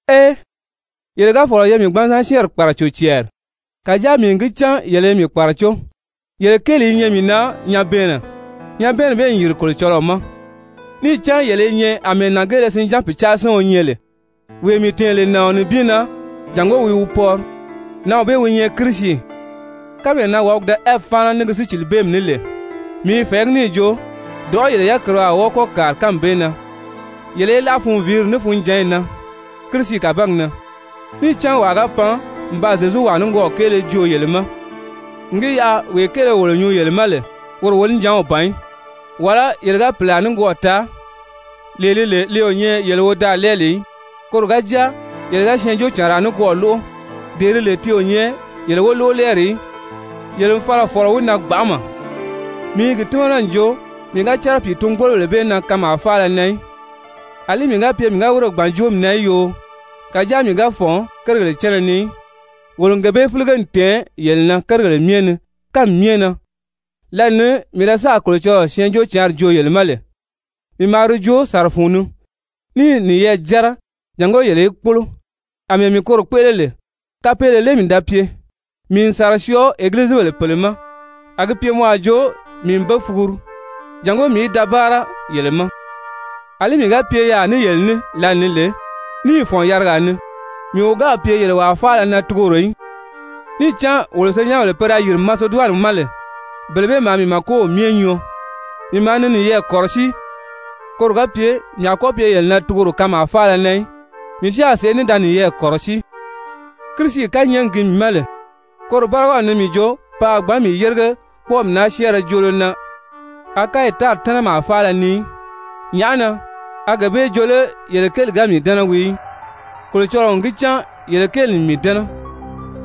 Ee! Yele ga fɔ̀lɔ ye mii gbanzan syɛ́ɛnri kpàraco cɛɛri! Kàjáa mii n gi cán yele i mii kpàracó! Yele kéeli i nyɛ mii na nyabɛɛnnɛ, nyabɛɛnni bee n yìri Kolocɔlɔɔ ma, níì cán yele i nyɛ àmɛɛ nàngeelesinján pìcaasiɔn nyɛ lè, wee mii tɛ̀ɛn lè nàɔn nibin na, jàngó wi wi pɔri, nǎnw bee wi nyɛ Kirisi. Kánmee na wàbigi da Ɛvi fáana ní gi sícilibeemi ní lè, mii i fɛ̀ɛgí níì jo dɔ̀ʔɔ́ yele yákiriw a wɔ́ɔ kɔ́ kàri kánmi bee na yele í láʔa funviiri ní funjǎnyi na Kirisi kàbangi na. Níì cán wàa ga pan n baa Zyezuwaa nikwɔɔ kéele joo yele ma n gi yaʔa wee kéele wolo nyuu yele ma lè woro wonijanw ban í, wàlá yele ga pìlaa nikwɔɔ taa lee li lè li o nyɛ yele wodaalɛɛli í, koro ga jáa yele ga syɛɛnjóocànraa nikwɔɔ lóʔo dee di lè ti o nyɛ yele wolóʔolɛɛri í, yele n fala n fɔ̀lɔ wi na gbanʔama. Mii i gi tímana n jo mii ga cɛ́rɛ pìitun-gbólobèle bee na kanmaa faala na í. Alí mii ga pye mii ga wírè gbàn joomi na í yoo, kàjáa mii ga fɔ̀n kérigèle cánna ni í, wolo n gee bee fílige n tɛ̀ɛn yele na kérigèle myɛ ni kánmi myɛ na. Lǎli ni mii sáà Kolocɔlɔɔ Syɛɛnjóocǎnri joo yele ma lè, mii maa di joo sàra fun ni, níì niyɛɛ jɛ́rɛ jàngó yele í kpólo, àmɛɛ mii koro kpéʔele lè, kapeele lé mii da pye? Mii n sàra syɔɔ egilizibèle pèle ma, a gi pye mɔ a jo mii n be fuguru jàngó mii í da báara yele ma. Alí mii ga pye yaà ní yele ní lǎli ni lè, níì fɔ̀n yarigaa ni, mii o gáà pye yele wàa faala na tugoro í, níì cán wolo senyɛnbèle pe da yìri Maseduwani ma lè, bele bee maa mii màkow myɛ nyɔɔ. Mii maa ni niyɛɛ kɔ̀rɔsíi, koro ga pye mii a kɔ́ pye yele na tugoro kanmaa faala na í, mii si a sèʔé ní da niyɛɛ kɔ̀rɔsíi. Kirisi kányɛɛgi gi mii ma lè, koro bárigaw ni mii jo pe a gbǎn mii yérige kpɔ́ɔmi naa joolo na Akayi tári tɛ́nɛmaa faala ni í. Nyàʔá na? A gee bee jo lé yele kéeli ga mii dɛ́nɛ wii í? Kolocɔlɔɔ n gi cán yele kéeli n mii dɛ́nɛ!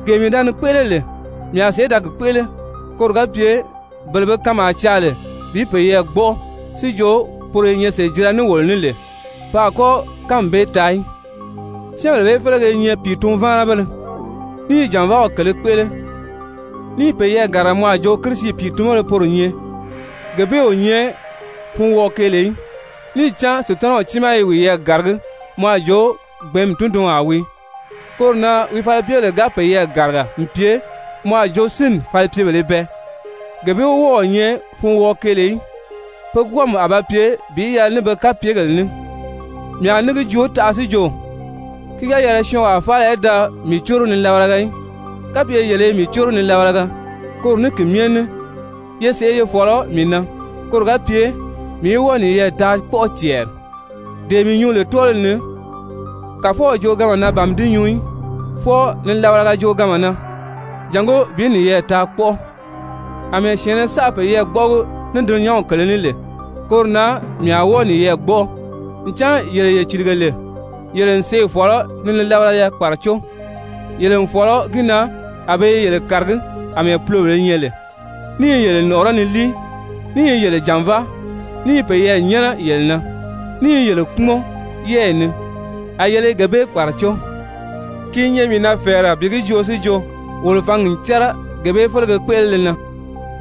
Gee mii da ni kpéʔele lè, mii a sèʔé da gi kpéʔele, koro ga pye bele be kanmaa caa lè bi peyɛɛ gbɔ́ʔɔ si jo poro i nyɛ sèjira ní wolo ní lè, pe a kɔ́ kánmi bee taa í. Syɛ́ɛnbèle bee félege i nyɛ pìitun-váanabéle, ní i jànvaaw kèlē kpéʔele, níì peyɛɛ gàriga mɔ a jo Kirisi pìitunbéle poro nyɛ. Gee bee o nyɛ funwɔɔ-keele í, níì cán Sutanaw tiimaa i wiyɛɛ gàragí mɔ a jo gbɛ̀ɛ́nmi tundunwaa wii. Koro na wi falipyebèle ga peyɛɛ gàriga n pye mɔ a jo sínni falipyebèlē bɛɛ, gee bee o wɔ́ɔ̄ nyɛ funwɔɔ-keele í. Pe kwɔ́ɔmi a ba pye bi yɛlɛ ní be kapyegèle ní. Mii a ní gi joo taʔa si jo, ki ga yɛlɛ syɔɔnwaa faala í da mii córo nilabalaga í. Kapye yele i mii córo nilabalaga, koro ní ki myɛ ní ye sèʔé ye fɔ̀lɔ mii na koro ga pye mii í wɔ́ɔ niyɛɛ taa kpɔ́ʔɔ cɛɛri. Dee mii nyuu lè tɔ́ɔliw ni, Kàfɔw jooganma na ban mii di nyuu í, fwɔɔ nilabalaga jooganma na jàngó bi niyɛɛ taa kpɔ́ʔɔ. Amɛɛ syɛ̀ɛnnɛ saʔa peyɛɛ gbɔ́ʔɔgi ní dulunyanw kèlē ní lè, koro na mii a wɔ́ɔ niyɛɛ gbɔ́ʔɔ. Ncan yele ye cìlige lè, yele n sèʔê fɔ̀lɔ ni nilabalaya kpàracó! Yele n fɔ̀lɔ gi na a be i yele kàragí àmɛɛ pulobèlē nyɛ lè, ní i yele nɔ̀ʔɔrɔ́ ni líi, ní i yele jànváa, ní i peyɛɛ nyɛ́nɛ yele na, ní i yele kpúmɔn yɛ́ɛyi ni, a yele i gee bee kpàracó. Ki i nyɛ mii na fɛ̀ɛrɛ bi gi joo si jo, wolo fǎngi n cɛ́rɛ gee bee félege kpéʔelele na.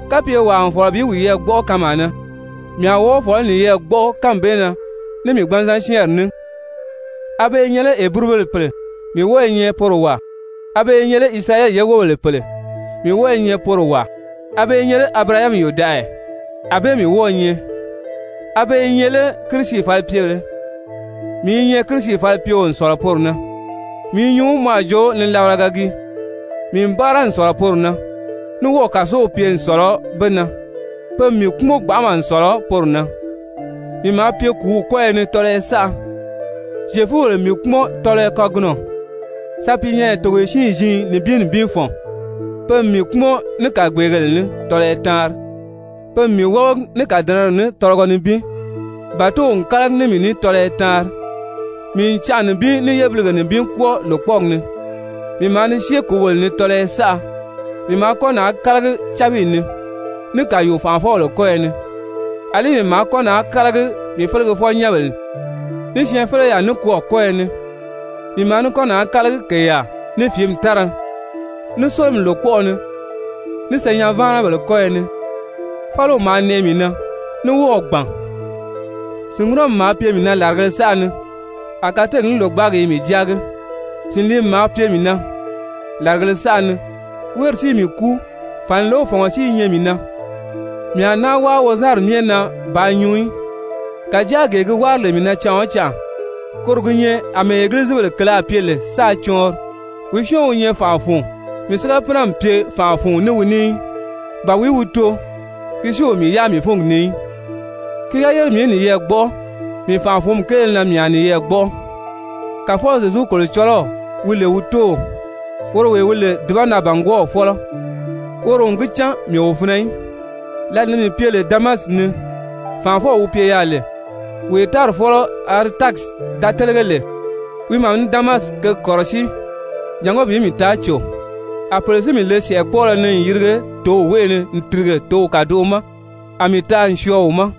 Kapye wàa n fɔ̀lɔ bi wiyɛɛ gbɔ́ʔɔ kanmaa na, mii a wɔ́ɔ fɔ̀lɔ bi niyɛɛ gbɔ́ʔɔ kánmi bee na ní mii gbanzan syɛ́ɛnri ní! A be i nyɛ lé Heburubèle pèle? Mii wɔ́ɔ i nyɛ poro wàa. A be i nyɛ lé Isirayɛli ye wóbèle pèle? Mii wɔ́ɔ i nyɛ poro wàa. A be i nyɛ lé Abirahami yòdaʔaya? Anbée mii wɔ́ɔ̄ nyɛ. A be i nyɛ lé Kirisi falipyebèlē? Mii i nyɛ Kirisi falipyeo n sɔ̀lɔ poro na. (Mii i nyuu mɔ a jo nilabalaga gii.) Mii n báara n sɔ̀lɔ poro na, ní wɔ́ɔ̀ kàsow pye n sɔ̀lɔ be na. Pe n mii kpúmɔn gbanʔama n sɔ̀lɔ poro na. Mii maa pye kùúw kɔ́yɔ ni tɔlɔyɔ saʔa. Zyefubèle n mii kpúmɔn tɔlɔyɔ kagunɔ sapiinyɛnyɛ togoye siin-ziin nibin nibin fɔ̀n. Pe n mii kpúmɔn ní kàgbeegèle ní tɔlɔyɔ taanri, pe n mii wábagi ní kàdɛnɛri ní tɔlɔgɔ nibin, bàtow n kálagi ní mii ní tɔlɔyɔ taanri, mii n canʔa nibin ní yébilige nibin kwɔ́ɔ lòkpɔɔgi ni. Mii maa ni syée kǔgèle ni tɔlɔyɔ saʔa, mii maa kɔ́ naà kálagi cábiyi ni, ní kàyuu-fànʔafɔbèle kɔ́yɔ ni, àlí mii maa kɔ́ naà kálagi mii felegefɔ-nyɛ́nbèle, ní syɛɛnfeleyaa nikwɔɔ kɔ́yɔ ni, mii maa ní kɔ́ naà kálagi kèyaa, ní fìími tára, ní sólomi lòkpɔʔɔ ni, ní senyɛn-váanabèle kɔ́yɔ ni. Fáliw maa nɛʔɛ mii na, ní wɔ́ɔ̀ gbàn. Sìnŋunɔmi maa pye mii na làrigēle saʔa ni, a kateegi ní lògbaagi i mii jáagi. Sìnliimi maa pye mii na làrigēle saʔa ni, wéeri si i mii kúu, fànilew fɔ̀ngɔ si i nyɛ mii na. Mii a náa wáa wozanri myɛ na bàā nyuu í, kàjáa gee gi wári lè mii na canʔa o canʔa, koro gi nyɛ àmɛɛ egilizibèle kèlē a pye lè sáā cɔɔnri. Wìí syɔ́ɔn wi nyɛ fànʔa fun, mii si ga pínɛ n pye fànʔa fun ní wi ní í? Ba wìí wi too, ki si o mii yáa mii fúngi ni í? Ki ga yére mii í niyɛɛ gbɔ́ʔɔ, mii fànʔa-fǔnmi kéele na mii a niyɛɛ gbɔ́ʔɔ. Kàfɔw Zyezu Kolocɔlɔw, wi lè wi Tóow, woro wee wi lè dùbanaa-bàngwɔɔw fɔ́lɔ, woro n gi cán mii o finɛ í! Lǎli ni mii pye lè Damasi ni, fànʔafɔw wi pye yaà lè, wee tári fɔ́lɔ Aretasi da télege lè, wi maa ni Damasi kěgi kɔ̀rɔsíi jàngó bi mii taa cò. A pèle si mii le sɛ̀ʔɛkpɔɔlɔ ni n yirige tǒw wéʔe ni n tìrige tǒw kàdoʔo ma, a mii taa n syɔɔ wi ma.